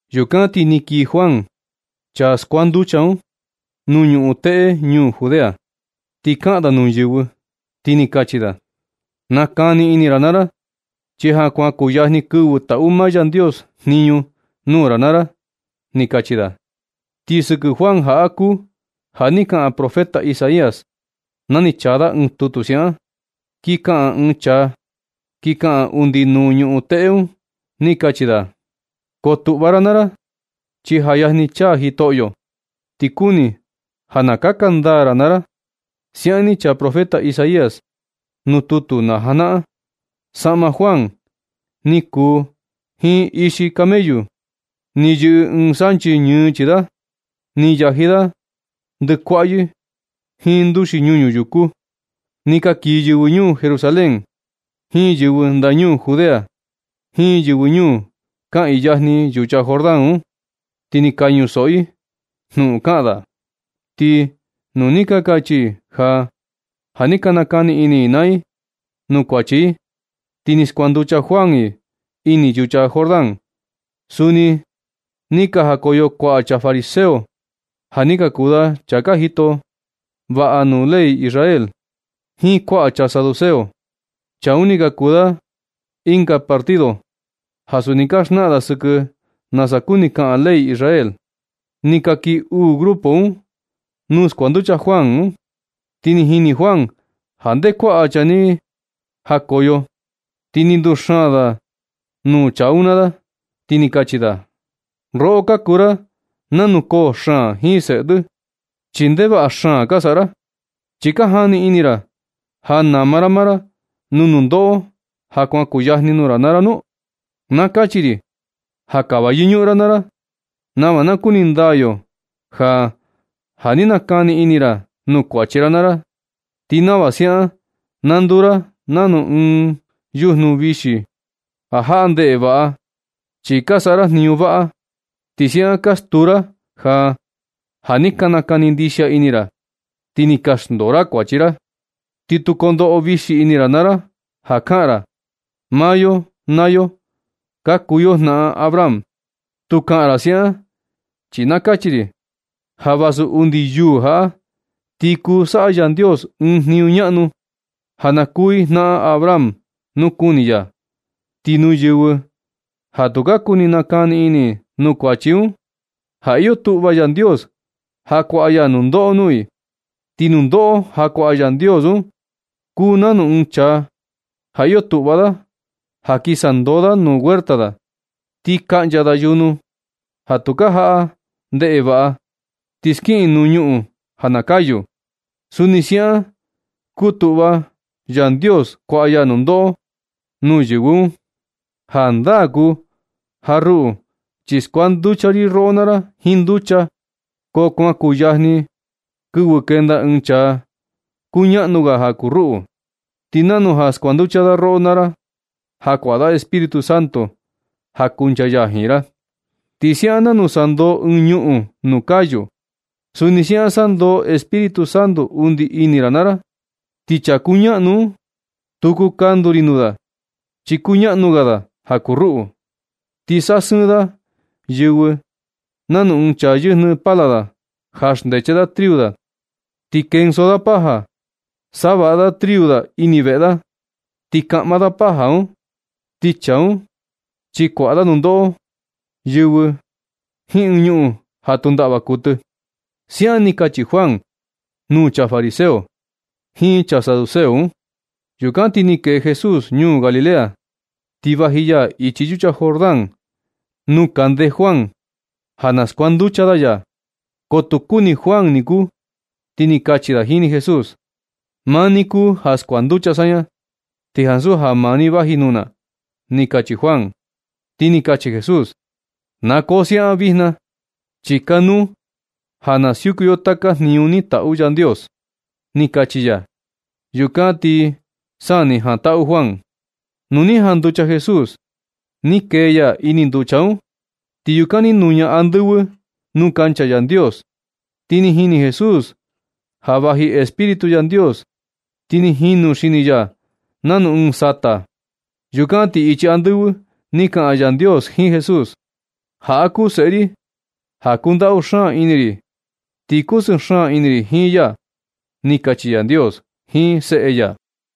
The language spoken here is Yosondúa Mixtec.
Yukan ti ni kii Juan, chaa skuanducha un, nuu ñuꞌun teꞌe ñuu Judea, ti kaꞌan da nuu yɨvɨ, ti ni kachi da: ―Nakani ini naa ra, chi ja kuan kuyajni kɨvɨ taꞌu maa Yandios jniñu nuu ra naa ra ―ni kachi da. Ti sɨkɨ Juan jaꞌa kuu ja ni kaꞌan profeta Isaías na ni chaa da ɨɨn tutu siaꞌan: Kin kaꞌan ɨɨn chaa, kin kaꞌan undi nuu ñuꞌun teꞌe un, ti kachi da: “Koo tuꞌva ra naa ra, chi ja yajni chaa Jitoꞌyo. Ti kuni ja na kaka ndaa ra naa ra.” Siaꞌan ni chaa profeta Isaías nuu tutu na janaꞌan. Saꞌma Juan ni kuu jiin ixi camellu. Ni yɨꞌɨ ɨɨn sanchi ñɨɨ chii da. Ni yaji da ndɨkuaꞌyɨ jiin nduxi ñuñu yuku. Ni ka kii yɨvɨ ñuu Jerusalén, jiin yɨvɨ ndañuu Judea, jiin yɨvɨ ñuu kaꞌiin yajni yucha Jordán un, ti ni ka ñusoꞌo i jnuꞌun kaꞌan da. Ti nu ni ka kachi i ja, ja ni ka nakani ini i naa i nuu kuachi i, ti ni skuanducha Juan i ini yucha Jordán. Suni ni ka jakoyo kuaꞌa chaa fariseo, ja ni ka kuu da chaa ka jito vaꞌa nuu ley Israel, jiin kuaꞌa chaa saduceo (chaa un ni ka kuu da ɨnga partido ja suni ka xnaꞌan da sɨkɨ nasa kuni kaꞌan ley Israel). Ni ka kii uu grupo un nuu skuanducha Juan, ti ni jini Juan ja nde kuaꞌa chaa un ni jakoyo. Ti ni nduxaan da nuu chaa un naa da, ti ni kachi da: ―Roꞌo ka kuu ra nanu koo xaan jiin seꞌe tɨ, chi ndevaꞌa xaan ka saꞌa ra. ¿Xi ka jani ini ra ja nama ra maa ra nuu nundoꞌo ja kuan kuu yajni nuu ra naa ra nu? Na kachi ri ja kava yɨñuꞌun ra naa ra nava na kuni ndaa yo ja, ja ni ka nakani ini ra nuu kuachi ra naa ra. Ti nava siaꞌan na nduu ra nanu ɨɨn yujnu vixi ja jaꞌa ndeꞌe vaꞌa, chi ka saꞌa ra jniñu vaꞌa. Ti siaꞌan ka stuu ra ja, ja ni ka nakani ndixia ini ra, ti ni ka xndoo ra kuachi ra. Ti tu kondoꞌo vixi ini ra naa ra ja kaꞌan ra: “Maa yo naa yo ka kuu yo jnaꞌan Abraham.” Tu kaꞌan ra siaꞌan, chi na kachi ri ja vasu undi yuū jaꞌa, ti kuu saꞌa Yandios ɨɨn jniñu ñaꞌnu ja na kuu i jnaꞌan Abraham, nu kuni ya. Ti nuu yɨvɨ ja tu ka kuni nakani ini i nuu kuachi un, ja iyo tuꞌva Yandios ja kuaꞌa ya nundoꞌo nuu i. Ti nundoꞌo ja kuaꞌa Yandios un kuu nanu ɨɨn chaa ja iyo tuꞌva da ja kin sandoo da nuu huerta da, ti kaꞌncha da yujnu ja tukaa jaꞌa ndeꞌe vaꞌa, ti skiꞌin nuu ñuꞌun ja na kayu. Suni siaꞌan kutuꞌva Yandios kuaꞌa ya nundoꞌo nuu yɨvɨ un. Jandaa kuu ja ruꞌu chi skuanducha ri roꞌo naa ra jiin nducha, ko kuan kuu yajni kɨvɨ kenda ɨɨn chaa kuu ñaꞌnu ga ja kuu ruꞌu. Ti nanu ja skuanducha da roꞌo naa ra ja kuaꞌa da Espíritu Santo ja kuncha ya jiin ra. Ti siaꞌan nanu sandoo ɨɨn ñuꞌun nuu kayu, suni siaꞌan sandoo Espíritu Santo undi ini ra naa ra. Ti chaa kuu ñaꞌnu un, tu kuu kandu ri nuu da, chi kuu ñaꞌnu ga da ja kuu ruꞌu. Ti sasɨɨn da yɨvɨ nanu ɨɨn chaa yɨjnɨ pala da ja xndeche da triu da, ti kendo da paja, savaꞌa da triu da ini veꞌe da, ti kaꞌma da paja un. Ti chaa un, chi kuaꞌa da nundoꞌo yɨvɨ jiin ɨɨn ñuꞌun ja tu ndaꞌva kuɨtɨ ―siaꞌan ni kachi Juan nuu chaa fariseo jiin chaa saduceo un. Yukan ti ni kee Jesús ñuu Galilea, ti vaji ya ichi yucha Jordán nuu kande Juan ja na skuanducha da ya. Ko tu kuni Juan ni kuu, ti ni kachi da jini Jesús: ―Maa ni kuu ja skuanducha saña, ti ansu ja maa ni vaji nuu na ―ni kachi Juan. Ti ni kachi Jesús: ―Na koo siaꞌan vijna, chi kanuu ja na siuku yo taka jniñu ni taꞌu Yandios ―ni kachi ya. Yukan ti sa ni jantaꞌu Juan. Nu ni janducha Jesús, ni kee ya ini nducha un, ti yukan ni nuña andɨvɨ nuu kancha Yandios, ti ni jini Jesús ja vaji Espíritu Yandios, ti ni jinu xini ya, nanu ɨɨn sata. Yukan ti ichi andɨvɨ ni kaꞌan Yandios jiin Jesús: ―Jaꞌa kuu seꞌe ri ja kundaꞌu xaan ini ri. Ti kusɨɨ xaan ini ri jiin ya ―ni kachi Yandios jiin seꞌe ya.